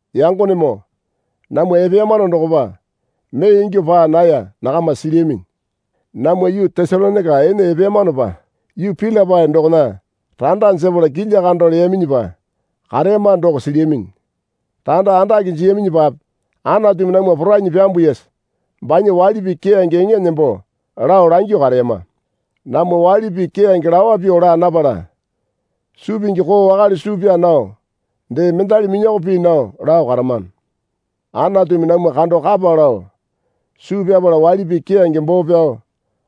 Yangonemoo namwa epeyamano dokopa mee ingyuo paa naya nakama silyaminyi. Namwa yuu Tesalonaika ene epeyamanopa yuu Pilipai dokona randa jepala kilya kando leyaminyipa kareyama doko silyaminyi. Randa andake jiyaminyipape Anatumi namwa porainyi pyambuyasa banya waili pii keyange eŋa nembo lao langyuo kareyama. Namwa waili pii keyange lawa pyuo laa napala suu pingi koo wakale suu pyaa nao dee mendali minyoko pii nao lao karamano. Anatumi namwa kando kapa lao suu pyapala waili pii keyange boo pyao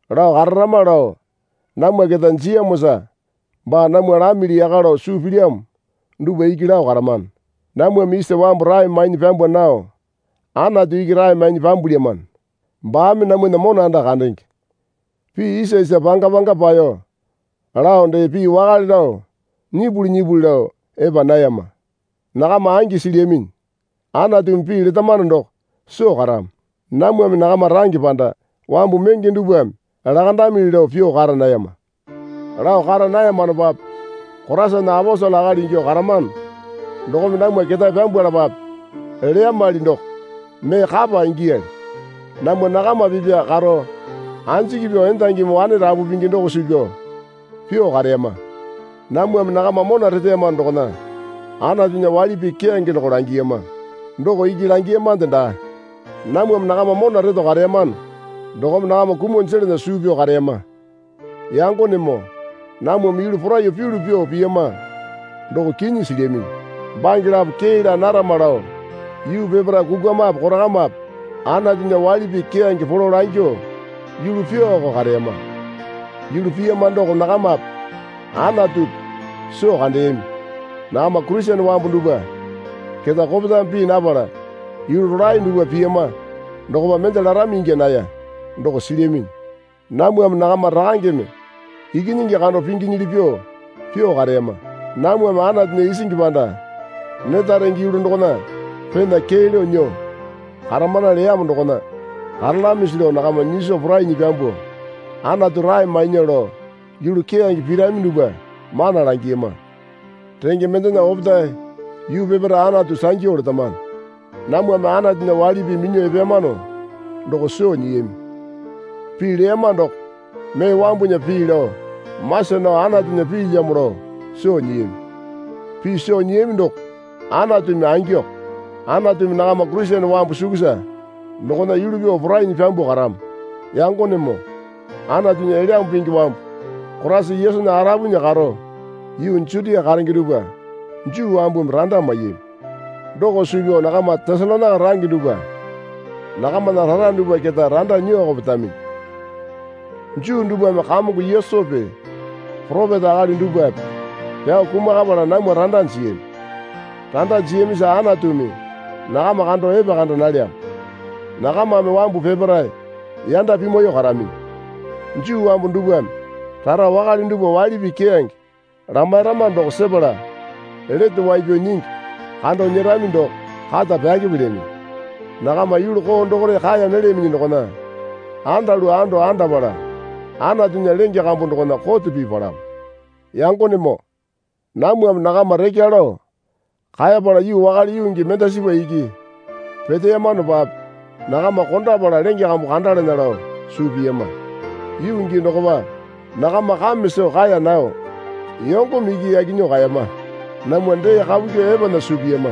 lao kararama lao namwa keta jiyamosa baa namwa lamili yaka lao suu pilyamo dupwa iki lao karamano. Namwame isa wambu rae mainyi pyambwa nao Anatu iki rae mainyi pyambwalyamano. Baame namwana mona anda kandenge. Pii isa isa panga panga paeyo lao dee pii wakale lao nyipuli nyipuli lao epa nayama. Nakama angi silyaminyi. Anatumi pii letamano doko soo karamo. Namwame nakama range panda wambu menge dupwame lakandamili lao pyuo kara nayama. Lao kara nayamanopape Koraisana aposele akali ingyuo karamano dokome namwa ketae pyambwalapape leyamali doko mee kapa ingiyali. Namwa nakama pipya karo anjiki pyuo endangimi wane rapu pingi doko suu pyao pyuo kareyama. Namwame nakama mona reteyamano dokona Anatunya waili pii keyange doko langiyama. Doko iki langiyamande daa. Namwame nakama mona reto kareyamano dokome nakama kumuo jelana suu pyao kareyama. Yangonemoo namwame yulu poraiyuo pyulu pyuo piyama doko kinyi silyaminyi. Bange lapo kee laa narama lao yuu peparae kukwamape korakamape Anatunya waili pii keyange polo langyuo yulu pyuoko kareyama. Yulu piyama doko nakamape Anatupi soo kandeyami. Nakama Kurisene wambu dupwa keta kopetame pii napala yulu rolae dupwa piyama dokopa mende larami ingya naya doko silyaminyi. Namwame nakama rakangeme ikinyingi kando pinginyili pyuo pyuo kareyama. Namwame Anatunya isingi panda neta renge yulu dokona pena kee lao nyuo karamana leyamo dokona karalamisi lao nakama nyiso porainyi pyambuo Anatu rae mainya lao yulu keyange pirami dupwa mana langiyama. Renge mendena opetae yuu peparae Anatu sangyu letamano. Namwame Anatunya waili pii minyuo epeyamano doko soo nyiyami. Pii leyama doko mee wambunya pii lao masa nao Anatunya piilyamo lao soo nyiyami. Pii soo nyiyami doko Anatumi angiko. Anatumi nakama Kurisene wambu sukusa dokona yulu pyuo porainyi pyambuo karamo. Yangonemoo Anatunya Elyambu Pingi wambu Koraisa Yesunya arupunya karo yuu Jutia karenge dupwa Juu wambumi randa maiyami. Doko suu pyao nakama Tesalonaika range dupwa nakamana rara dupwa keta randa nyuoko petaminyi. Juu dupwame Kamongo Yesupi poropeta akali dupwape pyao kumakapala namwa randa jiyami. Randa jiyamisa Anatumi nakama kando epekanda nalyamo. Nakamame wambu peparae yanda pimwaiyuo karaminyi. Juu wambu dupwame rara wakale dupwa waili pii keyange lamairama doko sepala lete wai pyao nyingi kando nyerami doko kata pyakepelyaminyi. Nakama yulu koo dokore kaeya nalyaminyi dokona andalu ando andapala Anatunya lenge kambu dokona kote pii palamo. Yangonemoo namwame nakama rekya lao kaepala yuu wakale yuu gii mendasipa iki peteyamanopape nakama kondapala lenge kambu kandalana lao suu piyama. Yuu gii dokopa nakama kame soo kaeya nao yongome iki yaki nyuo kaeyama. Namwa dee kapu kyuo epana suu piyama.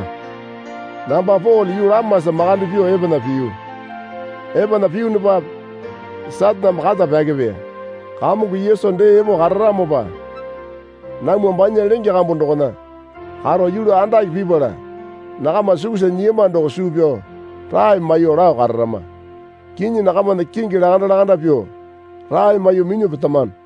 Namba Pole yuu lamasa makande pyuo epana piyu. Epana piyunupape Sataneme kata pyakepeya. Kamongo Yesu dee epo kararamopa namwa banya lenge kambu dokona karo yulu andake pipala nakama sukusa nyiyama doko suu pyao rae maiyuo lao kararama. Kinyi nakamana kingi lakanda lakanda pyuo rae maiyuo minyuo petamano.